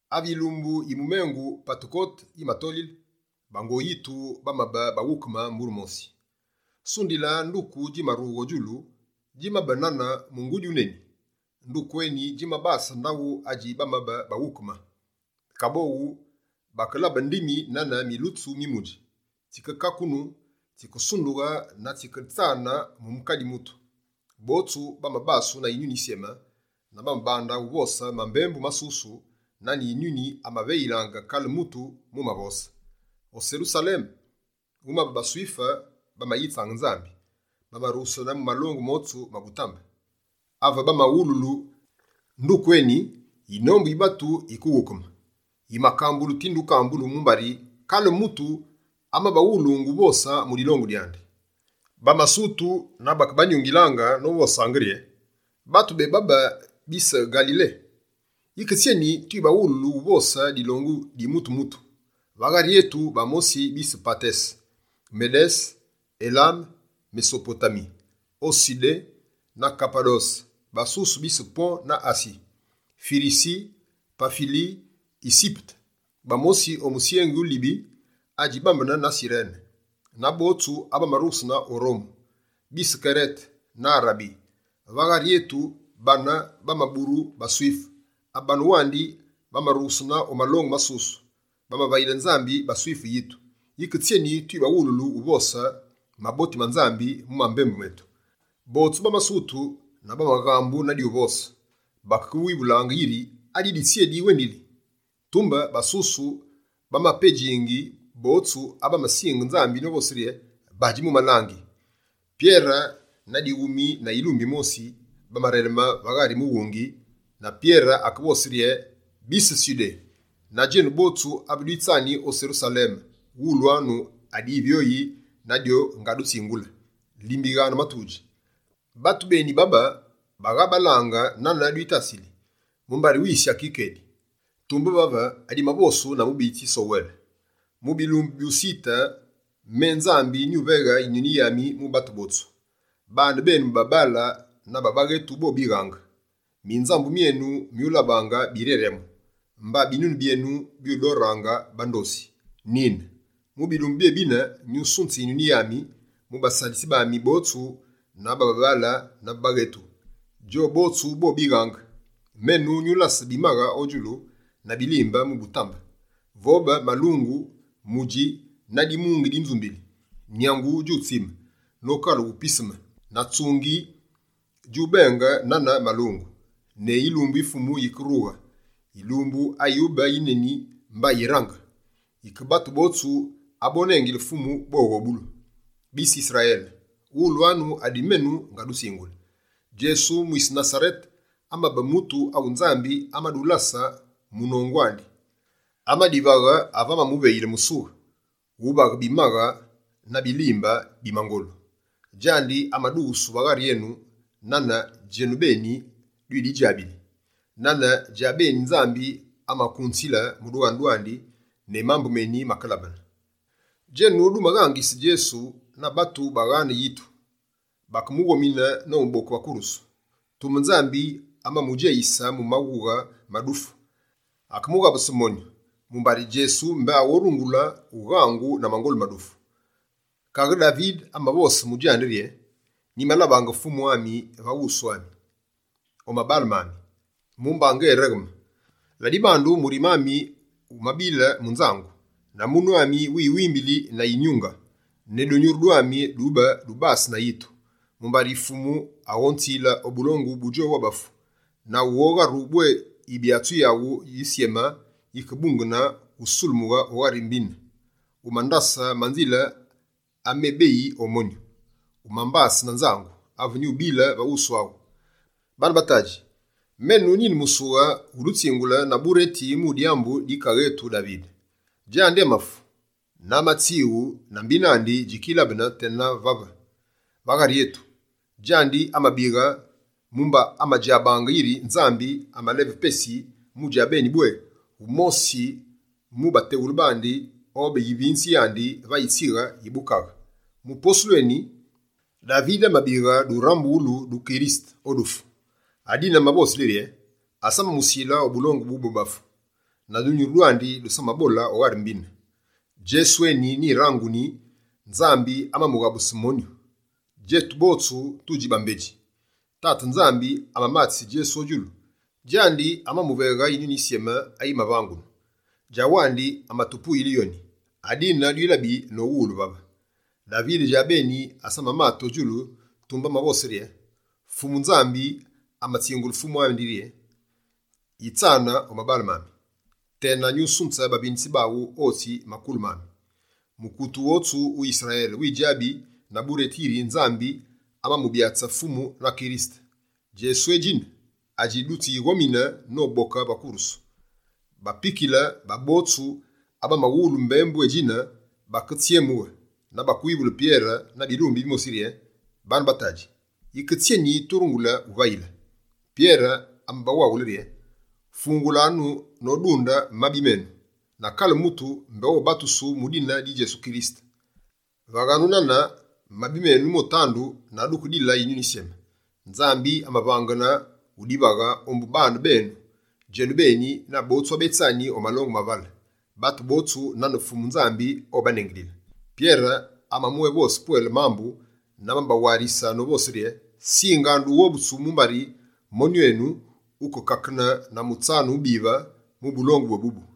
Ave yilumbu yi mumengu Patekote yimatolile, bango yitu bamabe baghukeme mbure mosi. Sundila, nduku djimarughe o djulu, djimabe nane mungudi wuneni. Nduku eni djimabase ndaghu adji bamabe baghukemine. Kaboghu, bakelabe ndimi nane milutsu mi mudji. Tsikekakunu, tsikesundughe na tsiketsane mu kale mutu. Botsu bamabasu na Yinyuni Yisyeme na bamabande uvose mambembu masusu, nane Yinyuni amaveyilaange kale mutu mumavose. O Serusaleme, wumabe baSwife bamayitsaange Nzambi, bamarughesene mu malongu motsu ma butambe. Ave bamawululu nduku eni, yinombu yi batu yikeghukeme. Yimakambulu tinde ukambulu, mumbari kale mutu amabaghulungu uvose mu dilongu dyandi. Bamasutu na bakebanyungilaange, novosaange rye: «Batu bebabe, bise Ngalile! Yike tsyeni twibaghululu, uvose dilongu di mutu-mutu? Va ghari etu, bamosi bise Patese, Medese, Elame, Mesopotami, o Sudé na Kapadose, basusu bise Pon na Asi, Firisi, Pafili, Yisipete, bamosi o musyengi wu Libi adji bambene na Sirene, na botsu abamarughesene o Rome, bise Kerete na Arabi. Va ghari etu, bane bamaburu baSwife, abane wandi bamarughesene o malongu masusu, bamavayile Nzambi baSwife yitu. Yike tsyeni twibaghululu uvose maboti ma Nzambi mu mambembu metu.» Botsu bamasutu na bamaghambu na dyuvose. Bamakewivulaange yiri: «Adidi tsyé diwendili?» Tumbe basusu, bamapedjingi botsu abamasinge Nzambi novose rye: «Badji mu malangi!» Pyere na dighumi na yilumbi yimosi, bamareleme va ghari mughungi, na Pyere akevose rye: «Bise Sudé, na djenu botsu abe dwitsani o Serusaleme, wulwanu adivyoyi na dyo ngadutsingule, limbighanu matudji. Batu beni babe bagha balange nane dwitasili, mumbari wisi aki kedi. Tumbe vave, adimavosu na mubiyitsi Sowele: “Mu bilumbu bi musitu, me Nzambi, nyuveghe Yinyuni yami mu batu botsu. Baane benu babaale na ba baghetu bobighaange. Minzambu myenu myulabaange biryaryamu, mba binunu byenu byudoraange bandosi. Nine, mu bilumbu byébine, nyusunze Yinyuni yami, mu basalitsi bami botsu ba babaale na ba baghetu. Djowu botsu bobighaange. Menu nyulase bimaghe o djulu, na bilimbe mu butambe, vobe malungu, mudji, na dimungi di nzumbili. Nyangu djutsime nokalughe piseme, na tsungi djubenge nane malungu, ne yilumbu yi Fumu yike rughe, yilumbu ayube yineni mba yirange. Yike batu botsu abonengile Fumu, boghobulu.” Bise Yisrayele, wulwanu adi menu ngadutsingule. Djesu mwise Nasarete amabe mutu awu Nzambi amadulase munongu andi. Amadivaghe ave amamuveyile musughe wuvaghe bimaghe na bilimbe bi mangolu. Djandi amadughusu va ghari enu nane djenubeni dwididjabili. Nane djabeni Nzambi amakunzile mu dughanu dwandi ne mambu meni makelabene, djenu dumaghangise Djesu na batu baghane yitu, bakemughomine nomuboke va kurusu. Tumbe Nzambi amamudjeyise mu maghughe ma dufu, akemughabuse monyu, mumbari Djesu mbé aghorungule ughangu na mangolu ma dufu. Kaghe Davide amavose mu djandi rye: “Nyimalabaange Fumu va wusu ami, o mabaale mami, mumba ngéregheme. Ladibandu, murime ami wumabile mu nzangu, na munu ami wiwimbili na yinyunge. Ne dunyuru dwami dube dubase na yitu, mumbari Fumu aghonzile o bulongu bu bobafu, na wughogharu bwé Yibyatsi yaghu Yisyeme, yikebungene wusulemughe o ghari mbine. Wumandase manzile amebeyi o monyu, wumbase na nzangu ave nyubile va wusu aghu.” Baane ba tadji, menu nine musughe wudutsingule na bureti mu dyambu di kaaghe etu Davide. Djandi amafu, na amatswighu na mbine andi djikilabene tena vave, va ghari etu. Djandi amabighe mumba amadjabaange yiri Nzambi amaleve pesi mu djabeni bwé, wumosi mu bateghule bandi obe yivinze yandi va yitsighe yi bukaghe. Mu posulu eni, Davide amabighe durambughulu du Kirisete o dufu. Adine amavosile rye: “Asamamusile o bulongu bu bobafu, na dunyuru dwandi dusamabole o ghari mbine.” Djesu eni nyiranguni, Nzambi amamughabuse monyu. Djetu botswanu tudji bambedji. Tate Nzambi amamatise Djesu o mabaale mandi. Djandi amamuveghe Yinyuni Yisyeme ayimavangenu. Djawandi amatupuyile yoni, adine dwilabi nowulu vave. Davide djabeni asamamate o djulu, tumbe amavose rye: “Fumu Nzambi amatsingule Fumu ami yiri: Yitsane omabale mami, tena nyusunze bavinitsi baghu otsi makulu maghu.” Mukute wotsu wu Yisrayele widjabi na bureti yiri Nzambi amamubyatse Fumu na Kirisete. Djesu édjine adji dutsi ghomine noboke va kurusu.» Bapikile ba botsu abamawulu mbembu édjine baketsyemughe, na bamawivule Pyere na bilumbi bimosi yiri: «Bane ba tadji, yike tsyeni turungule wuvayile?» Pyere amabawaghule rye: «Fungulanu nodunde mabi menu, na kale mutu mbé obatusu mu dine di Djesu Kirisete. Vaghanu nane, mabi menu motandu, na dukedile Yinyuni Yisyeme. Nzambi amaghane wudivaghe ombu bane benu, djenubeni, na botsu abetsani o malongu mavale, batu botsu nane Fumu Nzambi obanengilile.» Pyere amabwévose pwele mambu, na amabawarise novose rye: «Singanu dughobutsu mumbari monyu enu, wukekakene na mutsanu wubive wu bulongu bwébubu!»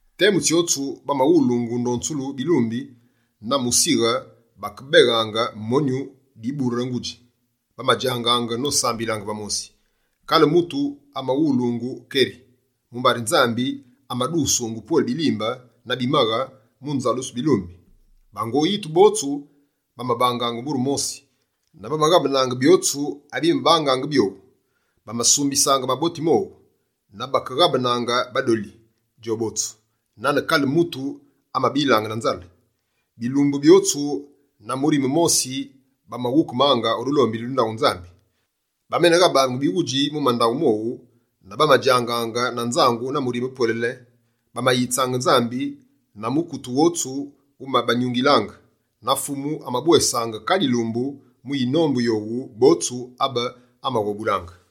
Temu tsyotsu, bamawulungu ndonzulu bilumbi na musighe, bakebeghange monyu dibure-ngudji, bamadjangaange nosambilaange va mosi. Kale mutu amawulungu keri, mumbari Nzambi amadughusungu pwele bilimbe na bimaghe mu nzalusulu bilumbi. Bango yitu botsu bamabangaange mbure mosi na bamaghabenaange byotsu abimabangaange byowu. Bamasumbisaange maboti mowu, na bakeghabenaange badoli djobotsu, nane kale mutu amabilaange na nzale. Bilumbu byotsu, na murime mosi, bamaghukemange o dulombili du ndaghu Nzambi. Bameneghabaange bighudji mu mandaghu mowu na bamadjangaange na nzangu na murime pwelele. Bamayitsaange Nzambi na mukute wotsu wumabanyungilaange. Na Fumu amabwesaange kale yilumbu mu yinombu yowu botsu abe amaghobulaange.